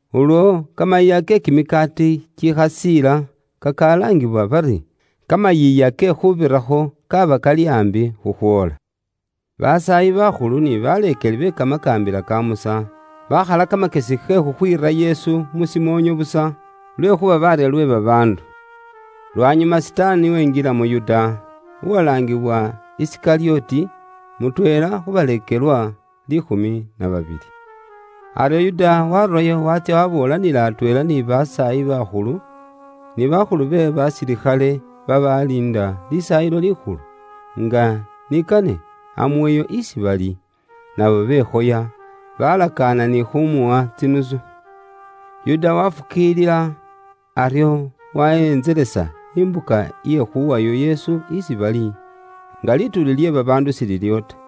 Ulwo kamayiiya ke kimikaati kikhasiila kakalaangibwa bari Kamayiiya ke Khuubirakho kaaba kali aambi khukhwoola. Basaayi bakhulu ni baleekeli be Kamakaambila ka Musa, bakhala kamakyesi ke khukhwiira Yesu mu shimoonyo busa, lwekhuuba baarya lwe babaandu. Lwanyuma Sitaani wenjila mu Yuda, uwalaangiwa Isikalyoti, mutweela khu baleekelwa liikhumi na babili. Aryo Yuda waarurayo waatsya waboolanila atweela ni basaayi bakhulu, ni bakhulu be basilikhale babaaliinda Lisaayilo Likhulu, nga ni kane amuweyo isi bali. Nabo bekhoya, balakaana ni khumuwa tsinusu. Yuda wafukiilila, aryo wahentselesa imbuka iye khuwayo Yesu isi bali, nga lituuli lye babaandu shililiwo ta.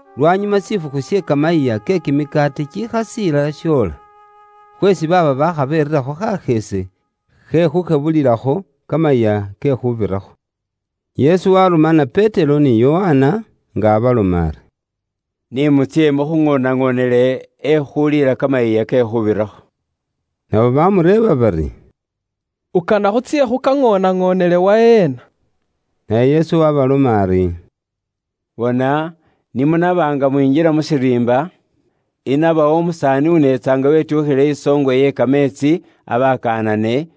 Lwanyuma shifukhu she kamayiiya ke kimikaati kikhasiila shoola; khweesi baaba baakha berirakho khasheese khe khushebulililakho Kamayiiya ke Khuubirakho. Yesu warumana Petero ni Yokana, nga abaloma ari, “Ni mutsye mukhuŋoonaŋonele ekhuliila Kamayiiya ke Khuubirakho.” Nabo bamureeba bari, “Ukana khutsye khukaŋoonaŋonele waheena?” Naye Yesu waabaloma ari, “Bona, ni munaba nga mwinjila mu shiriimba, inabawo umusaani uneetsa nga wetyukhile isoongwe iye kameetsi abakaanane,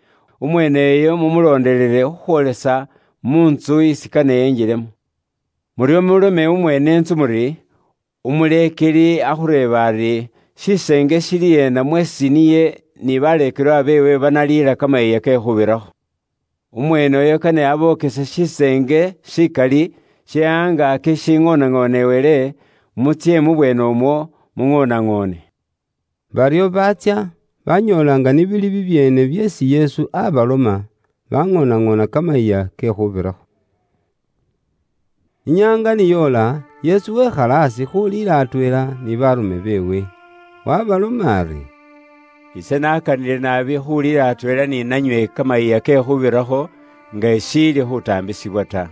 umweeneyo mumulondelele, khukhwoolesa mu ntsu isi kane enjilemo. Muryo mulome umweene intsu muri, ‘Umuleekeli akhureeba ari, shiseenge shiili ena mweesi niye ni baleekelwa beewe banaliila Kamayiiya ke Khuubirakho?’ Umweeneyo kane abokese shiseenge shikali she khungaaki shishiŋoonaŋonewele, mutsye mubweenemwo muŋoonaŋoone.” Baryo baatsya, banyoola nga ni bili bibyeene byeesi Yesu abaloma, baŋoonaŋoona Kamayiiya ke Khuubirakho. Inyaanga ni yoola, Yesu wekhala aasi khuuliila atweela ni baarume beewe. Wabaloma ari, “Ise nakanile naabi khuliila atweela ni nanywe Kamayiiya ke Khuubirakho nga ishiili khutaambisibwa ta.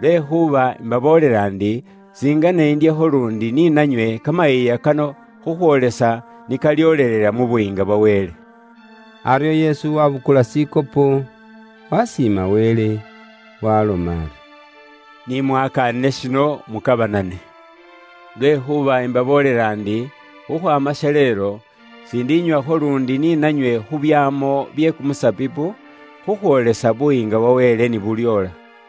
Lwekhuuba imbaboolela ndi, singene indyekho luundi ni nanywe kamayiiya kano khukhwoolesa ni kalyoolelela mu Buyiinga bwa Wele.” Aryo Yesu wabukula shikhopo, wasiima Wele, waaloma ari, “Ni mwakaanile shino mukabanane, lwekhuuba imbaboolela ndi, khukhwaama shaleelo, siindinywakho luundi ni nanywe khu byaamo bye kumusabibu, khukhwoolesa Buyiinga bwa Wele ni bulyoola.”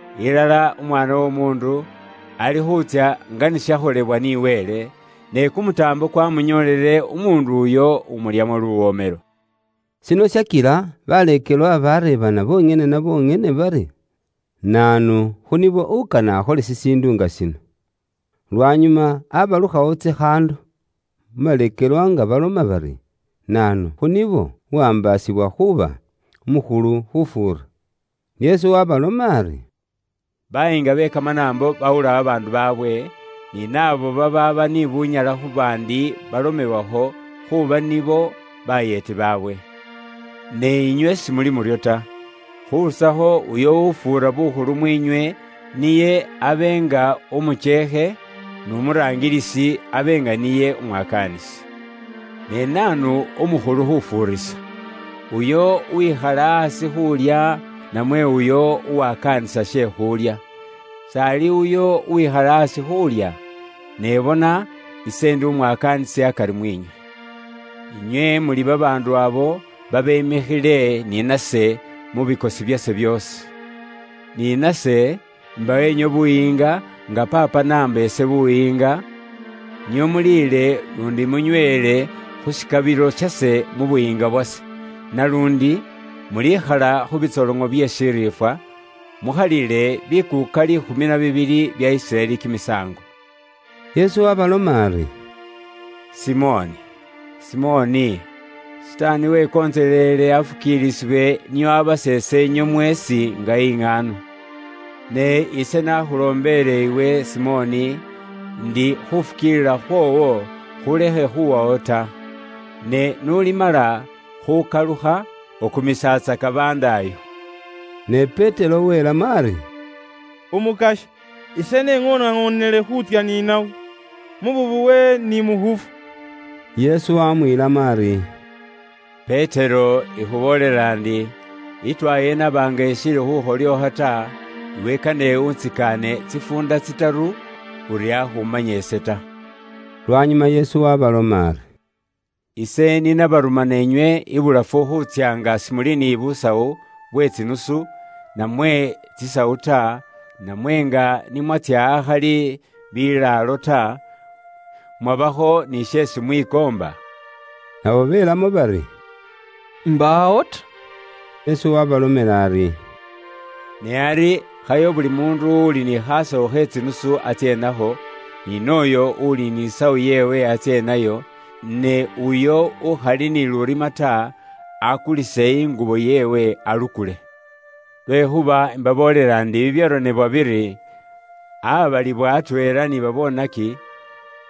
Ilala Umwaana w'Omuundu alikhuutsya nga ni shakholebwa ni Wele, ne kumutaambo kwamunyoolele umuundu uyo umulyamo luwomelo!” Shino shakila baleekelwa bareebana bonyene na bonyene bari naanu khu nibo ukane akhole shishiindu nga shino. Lwanyuma abalukhawo tsikhaando mu baleekelwa nga baloma bari naanu khu nibo uwaambaasibwa khuuba umukhulu khufuura. Yesu waabaloma ari, “Bayiinga be kamanaambo bawula babaandu baabwe, ni naabo babaaba ni bunyala khu baandi balomewakho khuuba nibo bayeeti baabwe. Ne inywe simuli muryo ta. Khurusakho uyo ufuura bukhulu mwiinywe niye abe nga umukyeekhe; n'umuraangilisi abe nga niye umwakaanisi. Ne naanu umukhulu khufuurisa? Uyo uwikhala aasi khuulya, namwe uyo uwakaanisa she khulya? S'ali uyo uwikhala aasi khuulya? Ne bona ise indi umwakaanisi akari mwiinywe. Inywe muli babaandu abo babemikhile ni nase mu bikosi byase byoosi. Ni nase imbawa inywe buyiinga nga Paapa n'abumba ise, nio muliile luundi munyweele khu shikabilo shase mu Buyiinga bwase. Naluundi mulikhala khu bitsoloŋo bye shiriifwa, mukhalile bikuuka liikhumi na bibili bya Isiraeli kimisaango.” Yesu waaloma ari, “Simoni, Simoni, Sitaani wekontseleele afukiilisibwe nio abaseese inywe mweesi nga iŋaano. Ne ise nakhuloombeele iwe Simoni, indi khufukiilila khwoowo khulekhe khuwawo ta. Ne n'ulimala khukalukha, ukumisatsaka bandaayo.” Ne Petero welamo ari, “Umukasya, ise neŋoonaŋonele khuutsya ni nawe mu bubowe ni mu khufwa.” Yesu wamwiilamo ari, “Petero ikhuboolela ndi, itwaya inaba nga ishiili khukholyookha ta, iwe kane untsikaane tsifuunda tsitaru uri akhumanya ise ta.” Lwanyuma Yesu waabaloma ari, “Ise ni nabarumana inywe ibulafu khuutsya nga simuli ni busawu bwe tsinusu, namwe tsisawu ta, namwe nga ni mwatsya akhali bilaalo ta, mwabakho ni sheesi mwikoomba?” Nabo belamo bari, “Mbaawo ta.” Yesu waabalomela ari, “Ne ari khayo buli muundu uuli ni khasawu khe tsinusu atsye nakho, ni nooyo uuli ni sawu yeewe atsye nayo, ne uyo ukhali ni lurima ta, akulise ingubo yeewe alukule. Lwekhuuba imbaboolela ndi bibyaronebwa biri, ‘Aabaalibwila atweela ni babonaki,’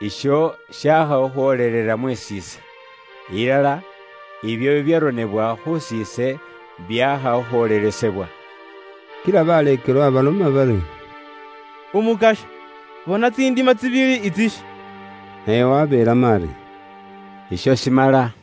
isho shaakha khukhwoolelela mus'iise. Ilala, ibyo bibyaronebwa khusiise byaakha khukhwoolelesebwa.” Kila baleekelwa baloma bari, “Umukasya, bona tsindima tsibili itsishi.” Naye waabeelamo ari, “Isho shimala.”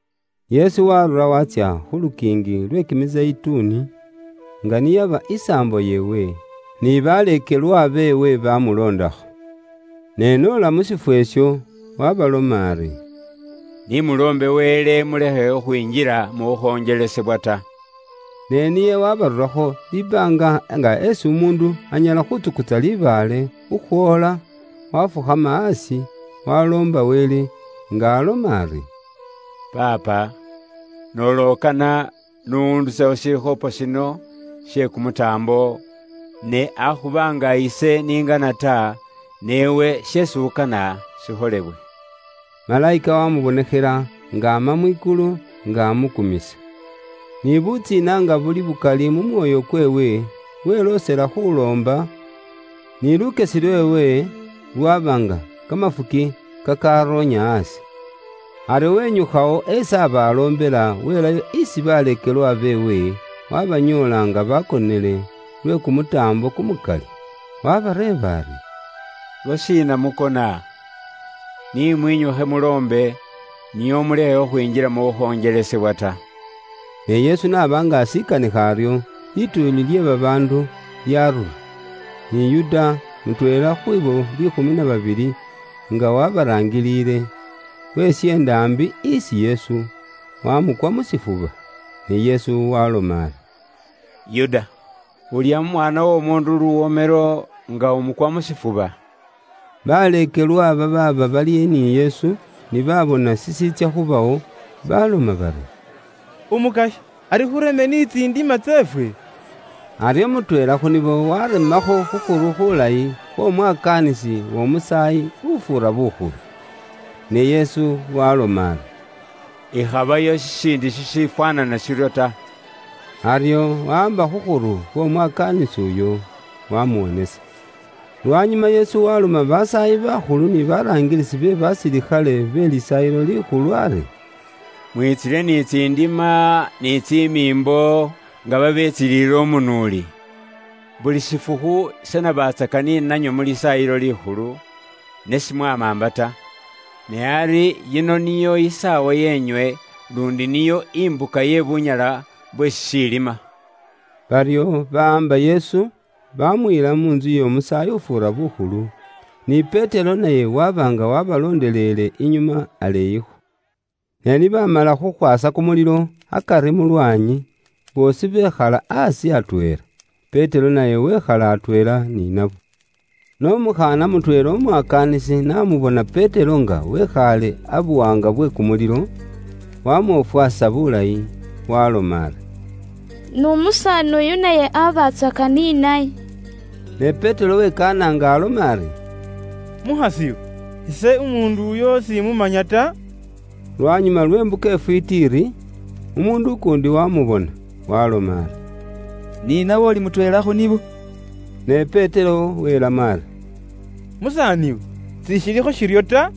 Yesu waarura waatsya khu lukiingi lwe Kimizeyituni, nga niyaba isaambo yeewe, ni baleekelwa beewe baamuloondakho. Ne n'ola mu shifwo isho, waabaloma ari, “Ni muloombe Wele mulekhe khukhwinjila mu khukhonjelesebwa ta.” Ne niye waabarurakho libaanga nga isi umuundu anyala khuutsukutsa libaale khukhwoola, waafukhama aasi, waaloomba Wele, nga aloma ari, “Paapa, noola ukana, n'undusekho shikhopo shino she kumutaambo, ne akhuba nga ise ni ngana ta, ne iwe sheesi ukana shikholebwe.” Malayika waamubonekhela nga aama mwikulu nga amukumisa. Ni butsiina nga buli bukali mu mwoyo kweewe, weloosela khuuloomba, ni lukyesi lweewe lwaba nga kamafuki kakaaroonya aasi. Aryo wenyukhawo esi aaba aloombela, welayo isi baleekelwa beewe, waabanyoola nga baakonele lwe kumutaambo kumukali. Waabareeba ari, “Lwashiina mukona? Ni mwinyukhe muloombe, nio mulekhe khwinjila mu khukhonjelesebwa ta.” Ne Yesu n'aba nga ashikanikha aryo, lituuli lye babaandu lyaarura, ni Yuda, mutweela khwiibo liikhumi na babili, nga waabaraangiliile, wesyeenda aambi isi Yesu, waamukwa mu shifuba. Ne Yesu waaloma ari, “Yuda, ulya mu Mwaana w'Omuundu luwomelo nga umukwa mu shifuba?” Baleekelwa babaaba bali ni Yesu ni baabona shishiitsya khubawo, baaloma bari, “Umukasya, ari khureme ni tsindima tseefwe?” Aryo mutweela khu nibo waaremakho khukhuru khuulayi khw'omwakaanisi w'Omusaayi ufuura bukhulu. Ne Yesu waaloma ari, “Ikhabayo shiindi shishifwaanana shiryo ta.” Aryo wawaamba khukhuru khw'Omwakaanisi uyo, waamuwonesa. Lwanyuma Yesu waaloma basaayi bakhulu ni baraangilisi be basilikhale be Lisaayilo Likhulu ari, “Mwitsile ni tsindima, ni tsimiimbo, nga babetsiliile umunuuli? Buli shifukhu ise nabatsaka ni nanywe mu Lisaayilo Likhulu, ne simwamaamba ta. Ne ari yino niyo isaawa yeenywe luundi niyo imbuka ye bunyala bwe shishiilima.” Baryo bawaamba Yesu, baamuyila mu ntsu y'omusaayi ufuura bukhulu, ni Petero naye waba nga wabaloondelele inyuma aleeyikho. Ne ni baamala khukhwaasa kumulilo akari mu lwaanyi, boosi bekhala aasi atweela. Petero naye wekhala atweela ni nabo. Ne umukhaana mutweela umwakaanisi n'amubona Petero nga wekhaale abuwaanga bwe kumulilo, wamwofwasa bulayi, waaloma ari, “N'umusaani uyu naye abatsaka ni naye.” Ne Petero wekaana nga aloma ari, “Mukhas'iwe, ise umuundu uyo simumanya ta.” Lwanyuma lwe mbuka ifwiiti iri, umuundu ukuundi wamubona, waaloma ari, “Ni nawe uli mutweela khu nibo.” Ne Petero welamo ari, “Musaaniwe, sishilikho shiryo ta.”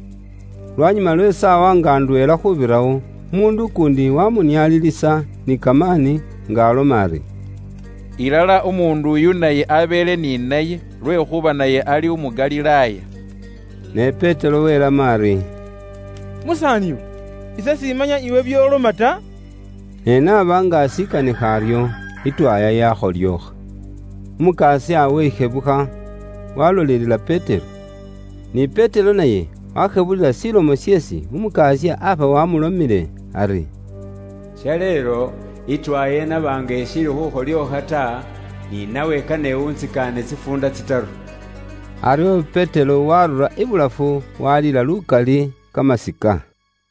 Lwanyuma lwe saawa nga ndweela khubirawo, umuundu ukuundi wamunialilisa ni kamaani nga aloma ari, “Mu ŋali umuundu uyu naye abeele ni Yesu, lwekhuuba naye ali umu Galilaaya.” Ne Petero welamo ari, “Musaaniwe, ise simanya iwe byoloma ta.” Ne n'aba nga ashikanikha aryo, itwaya yakholyookha. Umukasya weshebukha, walolelela Petero. Ni Petero naye washebulila shilomo sheesi Umukasya aba wamulomile ari, “Shaleelo, itwaya inaba nga ishiili khukholyookha ta, ni nawe kane untsikaane tsifuunda tsitaru.” Aryo Petero waarura ibulafu, walila lukali kamasika.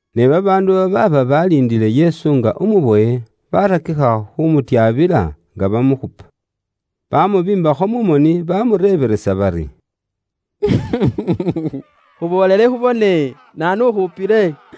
Ne babaandu babaaba baliindile Yesu nga umubowe, barakikha khumutyabila nga bamukhupa. Bamubiimbakho mu moni, bamureebelesa bari, “Iwe khola buŋoosi! Khuboolele, naanu ukhupile?”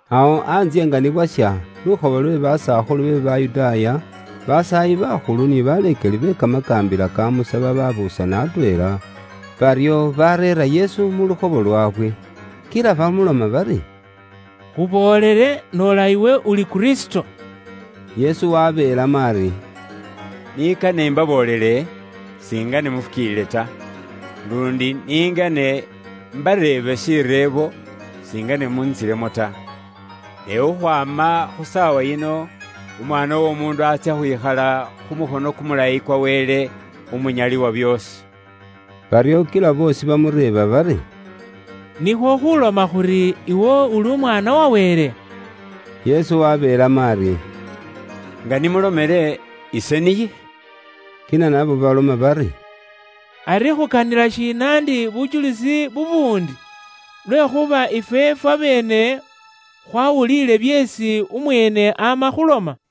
Awo antsye ni bwasha, lukhobo lwe basakhulu be Bayudaaya, basaayi bakhulu, ni baleekeli be kamakaambila ka Musa babuusana atweela, baryo bareera Yesu mu lukhobo lwaabwe. Kila bamuloma bari, “Khuboolele noola iwe uli Kristo.” Yesu wabeelamo ari, “Ni kane imbaboolele, singene mufukiilile ta. Luundi ningene imbareebe shireebo, singene muntsilemo ta. Ne khukhwaama khu saawa yino, Umwaana w'Omuundu atsya khwikhala khu mukhono kumulayi kwa Wele Umunyali wa byoosi.” Baryo kila boosi bamureeba bari, “Nikhwo khuloma khuri, iwe uli Umwaana wa Wele?” Yesu wabeelamo ari, “Nga ni mulomele, ise niye.” Kila nabo baloma bari, “Ari khukanila shiina ndi bujulisi bubuundi? Lwekhuuba ifwe fwabeene khwawuliile byeesi umweene ama khuloma.”